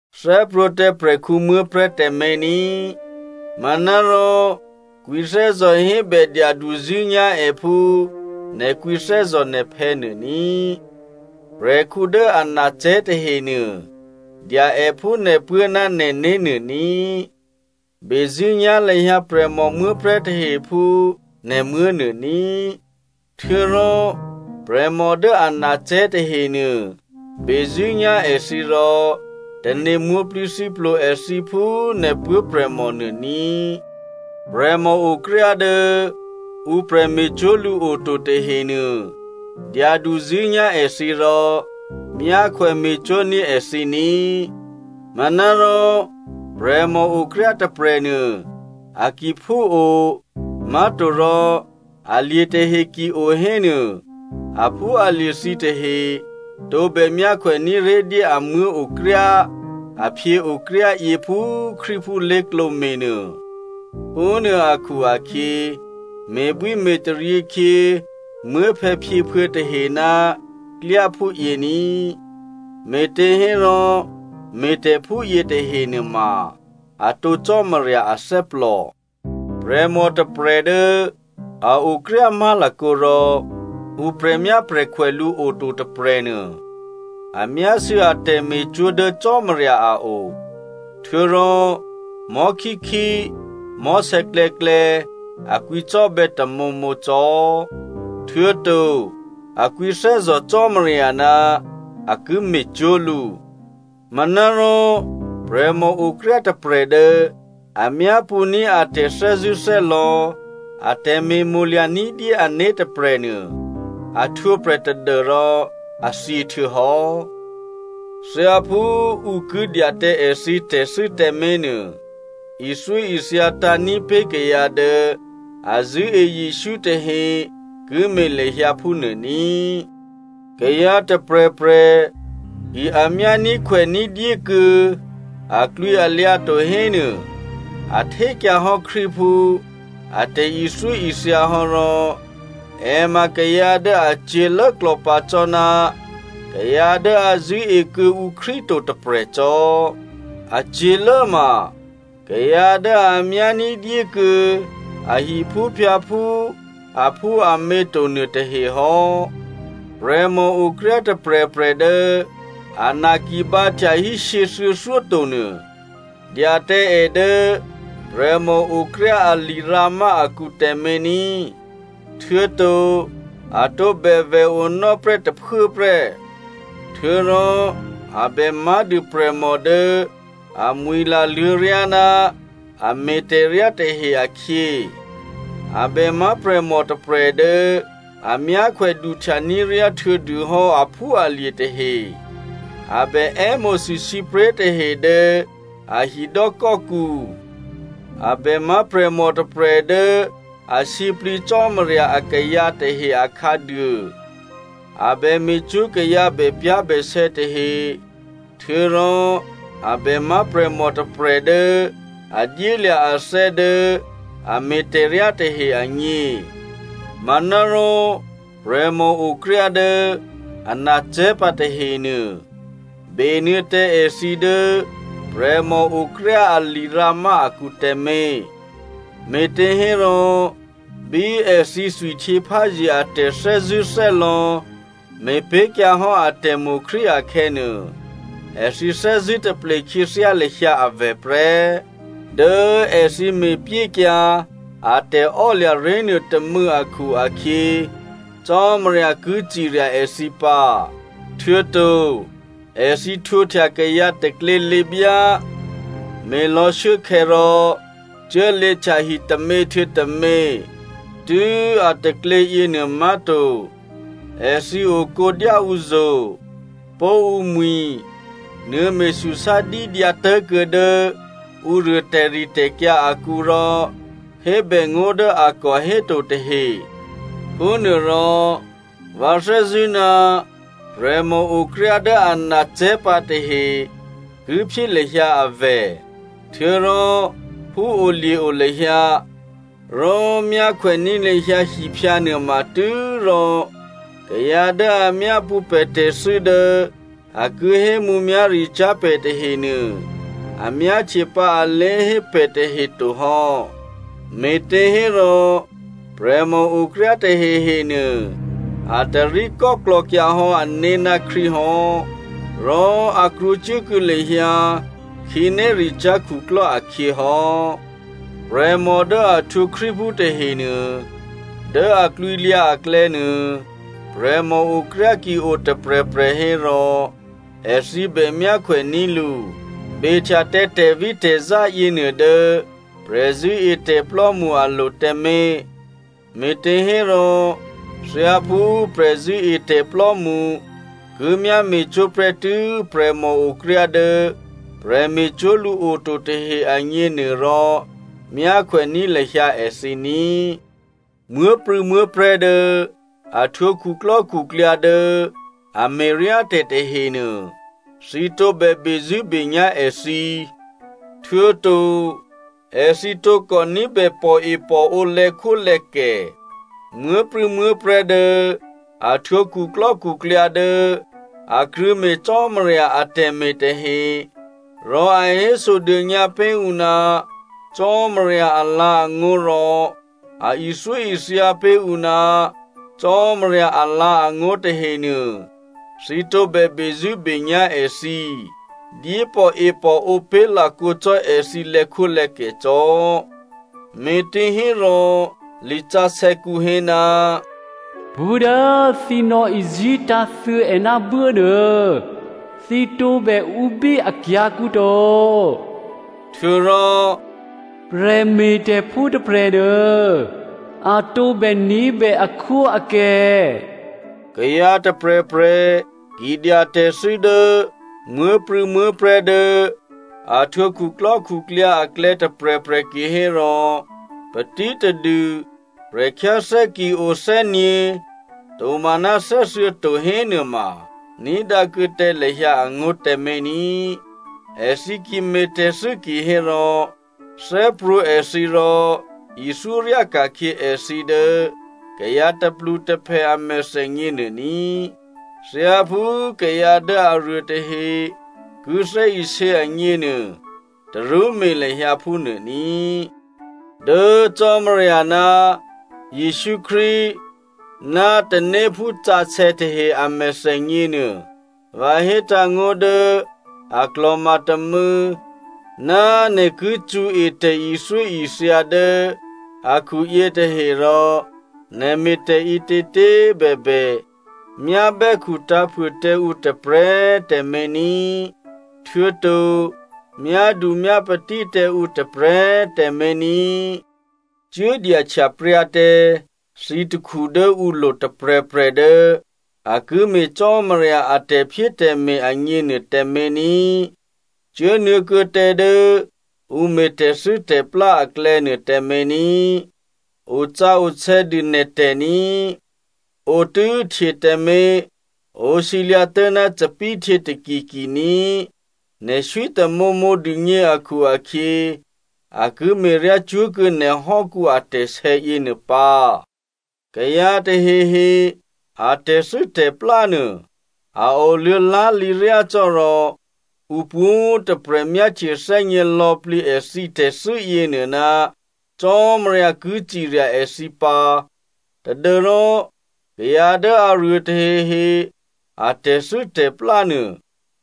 Thè́prwǒ̤ tǎ prè̤khǔ muố̤prè̤́ tǎmé̤ ní꤮, manárò kwǐthè́zò̤ hébè dyaduzṳ̂́nyá̤ è phú nè̤ kwǐthè́zò̤ nè̤phè̌ nuô ní꤮. Prè̤khǔ dố anacè̤́ tahenuô dya è phú nè̤puố̤ ná nè̤né̤ nuô ní꤮. Bezṳ̂́nyá̤ lahyǎ prè̤mò muố̤prè̤́ tahe phú nè̤muố̤ nuô ní꤮. Htuô̌rò prè̤mò dố anacè̤́ tahenuô, bezṳ̂́nyá̤ èthǐ rò tane̤ mwǒ̤plǐthǐplo èthǐ phú nè̤ puố̤prè̤mò nuô ní꤮. Prè̤mòokryá dố ǔ prè̤me̤cwó̤ lǔ oto tahenuô, dyaduzṳ̂́nyá̤ èthǐ rò myákhwème̤cwó̤ ní̤ èthǐ ní꤮. Manárò prè̤mòokryá tôprè̤nuô a ki phúo, má̤torò alye̤ tahe ki o hénuô, aphúalye̤ thǐtahe tǒbè myákhwèní̤ ré̤dyé a muố̤okryá a phyěokryá yě phú Krístuphú lé̤klǒ me̤nuô. Phúnuô akhu-akhyě me̤bwíme̤taryě khyě muốphè̌phyěphuô̌ tahe ná klyá phúyě ní꤮, me̤těhérò me̤tè̤phúyě tahe nuôma atǒ Cò́marya athè́plò. Prè̤mò tôprè̤ dố a okryá má̤lakǒ rò ǔ prè̤myáprè̤khwè lǔ oto tôprè̤nuô, a myásû̌ a tè̤me̤cwó̤ dố Cò́marya a o. Htuô̌rò mò̤́khíkhí mò̤́sè̌klè̌klè̌ a kwǐcò́bè̌ tamǒmǒ cò́. Htuô̌to a kwǐthè́zò̤ Cò́marya ná a ki me̤cwó̤ lǔ. Manárò prè̤mòokryá tôprè̤ dố a myápṳ̌ní̤ a tè̤thè́zṳ̂́thè́lò̌ a tè̤me̤mo̤lya̤ ní̤dyé ané̤ tôprè̤nuô, a htwǒprè̤ tadû́rò a thyě htuô̌hò́. Thyáphú ǔ ki dya tǎ èthǐ tè̤thû́ tèmé̤nuô, ithyóithya tǎ̤ní̤pé̤ kayǎ dố a zṳ̂́e Jesǔ tahe ki me̤ lahyǎ phúnuô ní꤮. Kayǎ tôprè̤prè̤ ki a myání̤khwèní̤ dyékuô̌ aklwǐalyǎ to hénuô, a htékyǎhò́ Krístuphú a tè̤ithyóithya hò́ rò è ma kayǎ dố a cyě̤lốklò̌ pǎ cò́ ná kayǎ dố a zṳ̂́ekuô̌ǔ Krístu to tôprè̤ cò́. A cyě̤lố ma kayǎ dố a myání̤ dyékuô̌ a hiphúphyǎphú aphúamě to nuôtahe hò́. Prè̤mòokryá tôprè̤prè̤ dố ana ki bǎhtyahí shyěthuô̌thyó tonuô, dya tǎ è dố prè̤mòokryá a lirǎmá akǔ tǎmé̤ ní, htuô̌to a tǒbè vè̤onò́ prè́ tôphuố prè́. Htuô̌rò a bè má̤dû prè̤mò dố amwi̤la luô̌ryá ná a me̤tè̤ryá tahe akhyě. A bè má̤ prè̤mò tôprè̤ dố a myákhwè duhtya ní̤ ryáhtuô̌ dûhò́ aphúalye̤ tahe, a bè è́mo̤sû sǐpré̤ tahe dố a hidò́kò́kǔ, a bè má̤ prè̤mò tôprè̤ dố a sǐplǐ Cò́marya akayǎ tahe akhǎduô, a bè me̤cwó̤ kayǎ bèpyá̤bèsè̌ tahe htuô̌rò a bè má̤ prè̤mò tôprè̤ dố a dyélya̤ athè́ dố a me̤tè̤ryá tahe agně. Manárò, prè̤mòokryá dố ana cè̤́pǎ tahenuô, benuô̌ tǎ èthǐ dố prè̤mòokryá a lirǎmá akǔ tǎmé̤. Me̤těhérò bí èthǐ thwihtyěpházye a tè̤thè́zṳ̂́thè́lò̌ me̤pé̤kyǎ hò́ atè̤mo̤ Krístu akhè̌nuô, èthǐ thè́zṳ̂́ taple khyěthyá lahyǎ avè̤ prè́. Dố èthǐ me̤pyékyǎ a tè̤ò́lya̤ ré̤nuô tômû̌ akhu-akhyě, Cò́marya ki cirya èthǐ pǎ. Htuô̌to èthǐ htwǒhtya kayǎ taklělěbyá, me̤lò̌ shuốkhè̌, rò cuốlě htyahi tômě htuô̌ tômě. Tû́ a taklě yěnuô má̤to, èthǐ okǒ dyáǔzo̤, pó̤ǔmwi̤, nuô̌me̤súsá dídyǎ tuố̤kuô̌ dố ǔruô tè̤ritè̤kyǎ akǔ rò hébè ngó̤ dố a kò héto tahe. Phúnuôrò vǎ thè́zṳ̂́ ná prè̤mòokryá dố anacè̤́pǎ tahe ki phyé lahyǎ avè̤. Htuô̌rò phúolye̤o lahyǎ, rò myákhwèní̤ lahyǎ hiphyǎ nuôma tû́rò kayǎ dố a myápṳ̌ pè̤ tè̤thû́ dố a ki hémǔmyá̤ricyá̤ pè̤ tahenuô, a myáhtyepǎ alé̤hé pè̤ tahe to hò́. Me̤těhérò prè̤mòokryá tahehe nuô, a taríkò́klò̌kyǎ hò́ ané̤ ná Krístu hò́, rò a krwǒcuốkuô̌ lahyǎ khǐnéricyá̤ khuklò́ akhyě hò́. Prè̤mò dố a htwǒ Krístuphú tahenuô, dố a klwǐlyǎ aklè̌nuô, prè̤mòokryá ki o tôprè̤prè̤ hérò èthǐ bè myákhwèní̤ lǔ. Behtya tǎ tè̤vítè̤zá yěnuô dố prè̤zṳ̂́etè̤plò́mṳ alo̤ tǎmé̤, me̤těhérò thyáphú prè̤zṳ̂́etè̤plò́mṳ ki myá me̤cwó̤ prè́tû́ prè̤mòokryá dố prè̤me̤cwó̤ lǔ oto tahe agněnuôrò, myákhwèní̤ lahyǎ èthǐ ní꤮. Muố̤prû̌muố̤prè̤́ dố a htwǒ khuklò́khuklyǎ dố a me̤ryátè̤ tahenuô, thǐ tǒbè bezṳ̂́benyá̤ èthǐ, htuô̌to èthǐ tǒkò ní̤bè pòepòǒ lè̌khwólè̌kè. Muố̤prû̌muố̤prè̤́ dố a htwǒ khuklò́khuklyǎ dố a krṳ̂̌me̤ Cò́marya atè̤me̤ tahe, rò a hésodônyǎ pé̤ ǔ ná Cò́marya alǎ̤angó̤ rò a ithyóithya pé̤ ǔ ná Cò́marya alǎ̤angó̤ tahenuô, thǐ tǒbè bezṳ̂́benyá̤ èthǐ, dyépòepòǒ pé̤ lakǒ cò́ èthǐ lè̌khwólè̌kè cò́. Me̤těhérò lisǎsè̌kǔ hé, “Pṳ́ dố thǐ nò̌izí̤ tǎ̤thuô̌è ná buốnuô, thǐ tǒbè ǔbí akyǎ̤kǔ to,” htuô̌rò “Prè̤me̤tè̤phú tôprè̤nuô a tǒbè ní̤bè akhwóakè.” Kayǎ tôprè̤prè̤ ki dya tè̤thû́ dố muố̤prû̌muố̤prè̤́ dố a htwǒ khuklò́khuklyǎ aklè̌ tôprè̤prè̤ kihérò patítadû prè̤khyáthè́ ki o thè́gně tomaná thè́thuô̌ to hénuôma ní̤dǎ kuô̌ tǎ lahyǎ angó̤ tǎmé̤ ní꤮. Èthǐ ki me̤ tè̤thû́ kihérò, thè́prwǒ̤ èthǐ rò ithyó ryá ka̤khyě èthǐ dố kayǎ tôplutôphè a mèthènyě nuô ní꤮. Thyáphú kayǎ dố aruô tahe ki thè́isě agněnuô tarú me̤ lahyǎ phúnuô ní꤮. Dố Cò́marya ná Jesǔ Krístu ná tanéphú sǎsè̌ tahe a mèthènyě nuô, vǎ hétǎ̤ngó̤ dố a klò̤ma tômû̌ ná nè̤ ki cṳ̌e tè̤ithyóithya dố akhu yětahe rò nè̤ me̤tè̤ ǐtětě꤮ bèbè, myábè́khu tǎ̤phuô tǎ ǔ tôprè̤꤮ tǎmé̤ ní꤮. Htuô̌to myádu myápatí tǎ ǔ tôprè̤꤮ tǎmé̤ ní꤮. Cuố dyahtyapryǎ tǎ thǐ takhu dố ǔlo̤ tôprè̤prè̤ dố a ki me̤ Cò́marya a tè̤phyétè̤me̤ agněnuô tǎmé̤ ní꤮. Cuốnuô̌ kuô̌ tǎ dố ǔ me̤ tè̤thû́tè̤plá aklè̌nuô tǎmé̤ ní꤮, osǎsè̌dû nè̤tè̤ ní꤮. Ǒtû́htyě tǎmé̤, ǒsǐlyǎ̤ tố̤ná thòbǐthèhtyě takitaki ní꤮. Nè̤ swí tamǒmǒ dûgně akhu-akhyě a ki me̤ryácwó̤kuô̌ nè̤hò́kǔ atè̤sè̌ yěnuô pǎ. Kayǎ tahehe a tè̤thû́tè̤plá nuô a oluô̌ lá̤lǐ ryácò́, rò ǔ pwǒ̤꤮ tôprè̤ myáhtye thè́gně lò̌plǐ èthǐ tè̤thû́ yěnuô ná Cò́marya ki cirya èthǐ pǎ tadû́rò kayǎ dố aruô tahehe a tè̤thû́tè̤plá nuô,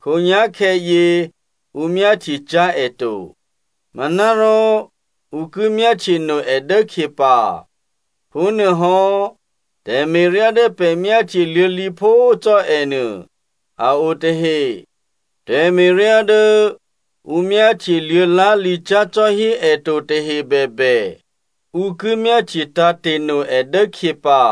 khǒnyá̤khè̌yě ǔ myáhtyecyá̤ è to. Manárò ǔ ki myáhtyeno è dốkhyě pǎ. Phúnuôhò́ tè̤me̤ryá dố pè̤ myáhtye luô̌ lǐphó cò́ è nuô a o tahe. Tè̤me̤ryá dố ǔ myáhtyeluô̌ lá̤lǐcyá̤ cò́hí è to tahe bèbè, ǔ ki myáhtye tǎ̤te̤no è dốkhyě pǎ.